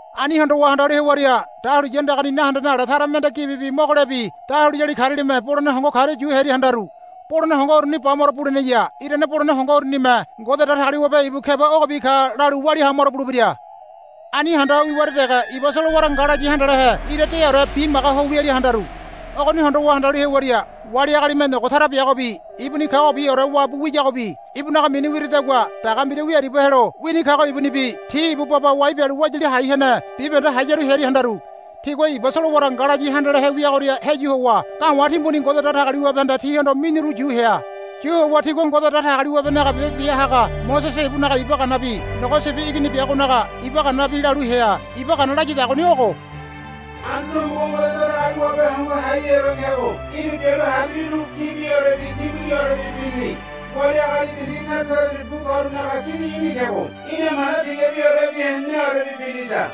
Ani hondowa handalu hewaria dahuliya andagani nahendene ale tara mende gibibi mogolebi dahuliyali karialime bolene hongo karia yu hearia handaru. Bolene hongo uruni bamaro buleneya. Irane bolene hongo urunime Ngode Datagaliwabe ibu keba ogobi ka lalu walia hamaro bulebira. Ani handa ho wiwaria dege iba solowara ngalayi handalehe ira deaore bimaga ho wiaria handaru. Ogoni hondowa handalu hewaria wali agalime nogo tara biagobi ibuni kagobiore wabu wiyagobi ibunaga mini wiradagua daga mbira wia aribia helo wini kago ibunibi ti ibu baba wai bialu wayali hai hene bibahende hayaru hearia handaru. Tigua iba solowara ngalayi handalehe wiagoria heyu howa ga̱wa̱ timbuni Ngode Datagaliwabehanda tihondo miniru yu hea. Yu howa tigua Ngode Datagaliwabenaga biabe bia haga Mosese ibunaga iba ganabi Nogo Sibi Igini biagonaga iba ganabi lalu hea. Iba gana layadagoni ogo, Anduane Homogo Ngode Datagaliwabe Hongo Haiheore kego í̠na bialu hariliru gibiorebi timbuniorebi birili. Wali agali dindi tara tarani bu karunaga kini í̠ni kego í̠namana tigabiorebi heneneorebi birilida.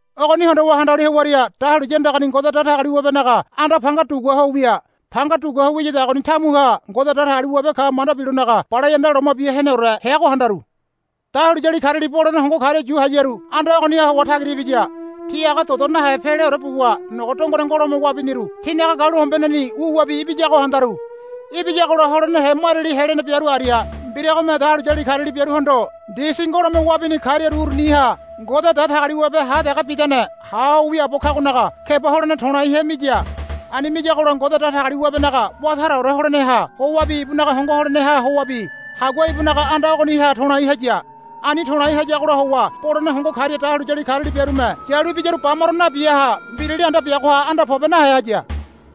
Ogoni hondowa handalu hewaria dahuliya andagani Ngode Datagaliwabenaga anda panga dugua ho wia. Panga dugua ho wiyadagoni tamuha Ngode Datagaliwabe ka manda bilonaga Balai Anda Loma Bia Heneore heago handaru. Dahuliyali kariali bolene hongo karia yu hayaru anda ogoniha howa tagira ibiya. Ti aga dodo nahe peweleore buwa nogo dongone ngolome wabiniru tinaga galuhombeneni wuwabi ibiyago handaru. Ibiyagola holenehe mariali helene biaru aria mbiragome dahuliyali kariali biaruhondo ndisi ngolome wabini kariaru uruniha Ngode Datagaliwabe ha dege bidane ha ho wiaabo kagonaga keba holene to̱laihe miya. Ani miyagola Ngode Datagaliwabenaga wá taraore holeneha howabi ibunaga hongo holeneha howabi hagua ibunaga anda ogoniha to̱lai haya. Ani to̱lai hayagola howa bolene hongo karia dahuliyali kariali biarume yalu ibiyaru bamaro nabiaha mbirali anda biagoha anda pobe nahe haya.